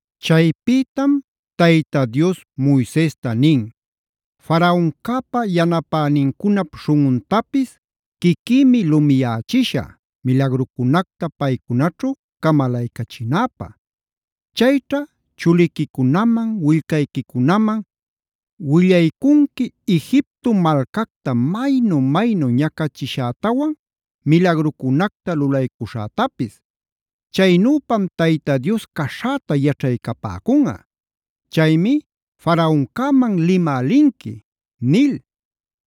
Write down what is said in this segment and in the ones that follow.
Chaypïtam Tayta Dios Moisesta nin: “Faraoncäpa yanapänincunap śhunꞌuntapis quiquïmi lumiyächishä milagrucunacta paycunaćhu camalaycachinäpä. Chayćha chuliquicunaman, willcayquicunaman willaycunqui Egipto malcacta maynu-maynu ñacachishätawan milagrucunacta lulaycuśhätapis. Chaynüpam Tayta Dios caśhäta yaćhaycapäcunꞌa. Chaymi Faraoncäman limä linqui” nil.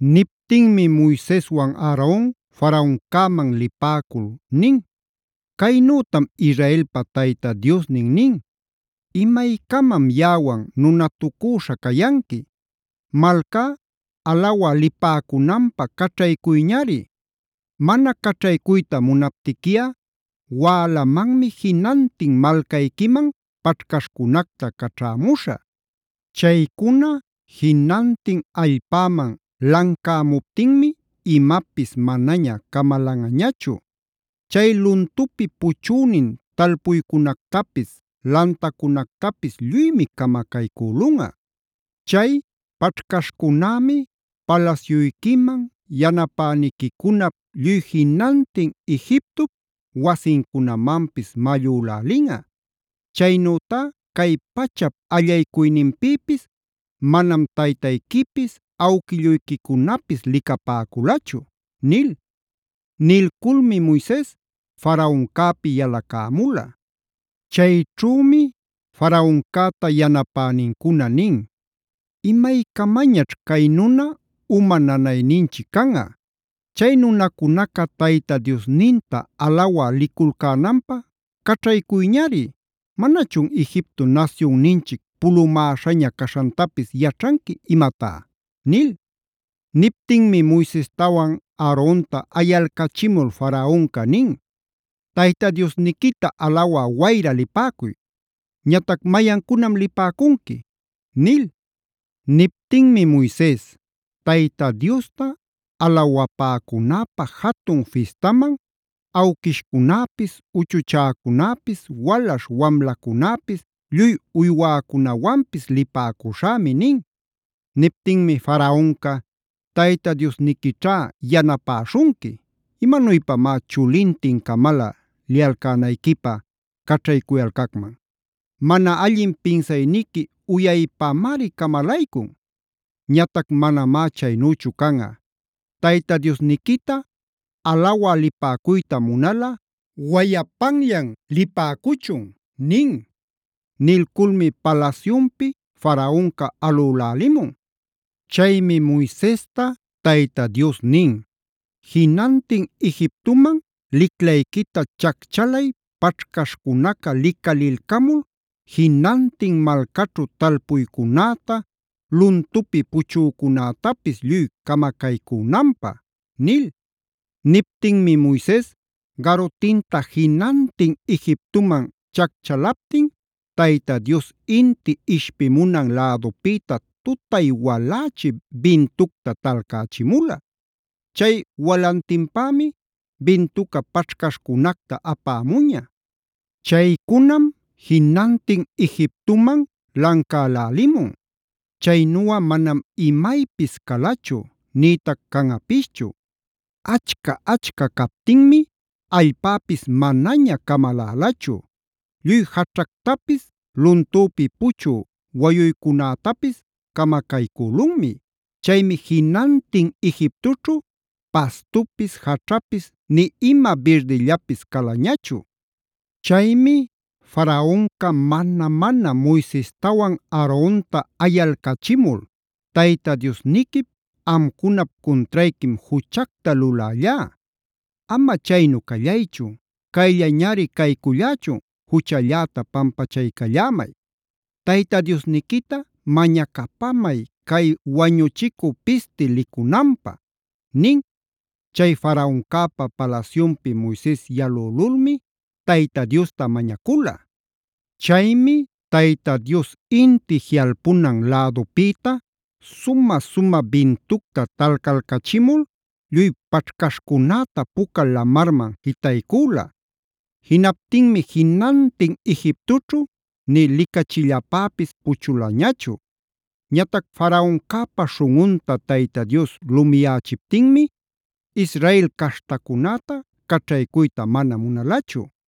Niptinmi Moiseswan Aaron Faraoncäman lipäcul nin: “Caynütam Israelpa Tayta Diosnin nin: ‘¿Imaycamam yaꞌawan nunatucüśha cayanqui? Malcá alawa lipäcunanpä caćhaycuyñari. Mana caćhaycuyta munaptiquiꞌa wälamanmi jinantin malcayquiman paćhcaśhcunacta caćhämuśhä. Chaycuna jinantin allpäman lancämuptinmi imapis manaña camalanꞌañachu. Chay luntupi puchünin talpuycunactapis, lantacunactapis lluymi camacaycülunꞌa. Chay paćhcaśhcunämi palasyuyquiman, yanapäniquicunap, lluy jinantin Egiptop wasincunamanpis mallülälinꞌa. Chaynütá cay pachap allaycuyninpïpis manam taytayquipis, awquilluyquicunapis licapäculachu’” nil. Nilculmi Moises Faraoncäpi yalacämula. Chayćhümi Faraoncäta yanapänincuna nin: “¿Imaycamañaćh cay nuna uma nanayninchic canꞌa? Chay nunacunaca Tayta Diosninta alawa liculcänanpä caćhaycuyñari. ¿Manachun Egipto nasyunninchic pulumäśhaña caśhantapis yaćhanqui imatá?” nil. Niptinmi Moisestawan Aaronta ayalcachimul Faraonca nin: “Tayta Diosniquita alawa wayra lipäcuy. Ñatac ¿mayancunam lipäcunqui?” nil. Niptinmi Moises: “Tayta Diosta alawapäcunäpä jatun fistaman awquishcunäpis, uchuchäcunäpis, walaśh wamlacunäpis, lluy uywäcunawanpis lipäcuśhämi” nin. Niptinmi Faraonca: “¡Tayta Diosniquićhá yanapäśhunqui! ¿Imanuypamá chulintin-camalä liyalcänayquipä caćhaycuyalcacman? ¡Mana allin pinsayniqui uyaypamari camalaycun! Ñatac manamá chaynüchu canꞌa. Tayta Diosniquita alawa lipäcuyta munalꞌa wayapanllan lipäcuchun” nin. Nilculmi palasyunpi Faraonca alülälimun. Chaymi Moisesta Tayta Dios nin: “Jinantin Egiptoman liclayquita chacchalay paćhcaśhcunaca licalilcamul jinantin malcaćhu talpuycunäta, luntupi puchücunätapis lluy camacaycünanpä” nil. Niptinmi Moises garutinta jinantin Egiptoman chacchalaptin Tayta Dios inti ishpimunan lädupïta tutay walächi bintucta talcächimula. Chay walantinpämi bintuca paćhcaśhcunacta apämuña. Chaycunam jinantin Egiptoman lancälälimun.a Chaynuꞌa manam imaypis calachu nïtac canꞌapischu. Achca-achca captinmi allpäpis manaña camalälachu. Lluy jaćhactapis luntüpi puchü wayuycunätapis camacaycülunmi. Chaymi jinantin Egiptoćhu pastupis, jaćhapis nï ima birdillapis calañachu. Chaymi Faraonca mana-mana Moisestawan Aaronta ayalcachimul: “Tayta Diosniquip, amcunap cuntrayquim juchacta lulällá. Ama chaynu callaychu cayllañari caycullächun, juchalläta pampachaycallämay. Tayta Diosniquita mañacapamay cay wañuchicü pisti licunanpä” nin. Chay Faraoncäpa palasyunpi Moises yalülulmi Tayta Diosta mañacula. Chaymi Tayta Dios inti jiꞌalpunan lädupïta sumä-sumä bintucta talcalcachimul lluy paćhcaśhcunäta Puca Lamarman jitaycüla. Jinaptinmi jinantin Egiptoćhu nï licachillapäpis puchulañachu. Ñatac Faraoncäpa śhunꞌunta Tayta Dios lumiyächiptinmi Israel caśhtacunäta caćhaycuyta mana munalachu.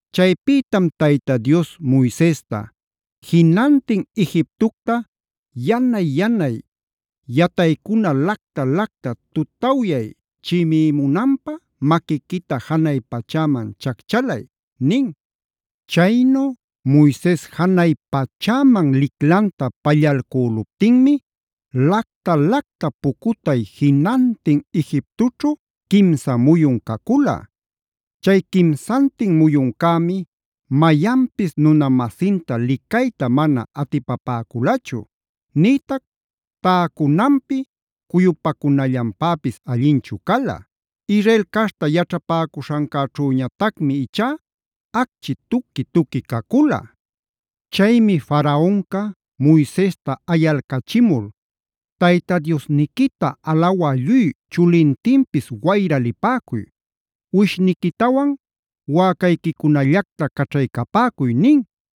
Chaypïtam Tayta Dios Moisesta: “Jinantin Egiptocta yanay-yanay yataycuna lacta-lacta tutawyay chimïmunanpä maquiquita janay pachäman chacchalay” nin. Chaynu Moises janay pachäman liclanta pallalcüluptinmi lacta-lacta pucutay jinantin Egiptoćhu quimsa muyun cacula.b Chay quimsantin muyuncämi mayanpis nuna-masinta licayta mana atipapäculachu, nïtac täcunanpi cuyupacunallanpäpis allinchu cala. Israel caśhta yaćhapäcuśhancäćhüñatacmi ichá acchi tuqui-tuqui cacula. Chaymi Faraonca Moisesta ayalcachimul: “Tayta Diosniquita alawa lluy chulintinpis wayra lipäcuy. Uwishniquitawan wäcayquicunallacta caćhaycapäcuy” nin.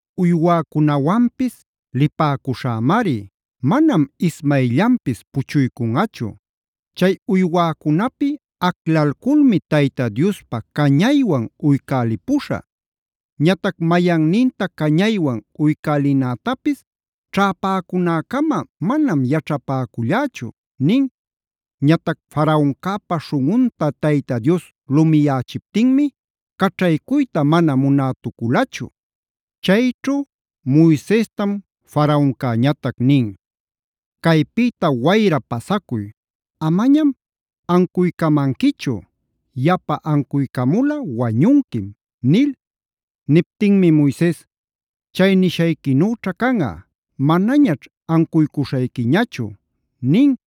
Uywäcunawanpis lipäcuśhämari manam ismayllanpis puchuycunꞌachu. Chay uywäcunapi aclalculmi Tayta Diospa cañaywan uycälipuśhä. Ñatac mayanninta cañaywan uycälinätapis ćhäpäcunäcama manam yaćhapäcullächu” nin. Ñatac Faraoncäpa śhunꞌunta Tayta Dios lumiyächiptinmi caćhaycuyta mana munätuculachu. Chayćhu Moisestam Faraoncañatac nin: “Caypïta wayra pasacuy. Amañam ancuycamanquichu; yapa ancuycamulꞌa wañunquim” nil. Niptinmi Moises: “¡Chay nishayquinüćha canꞌa! Manañaćh ancuycuśhayquiñachu” nin.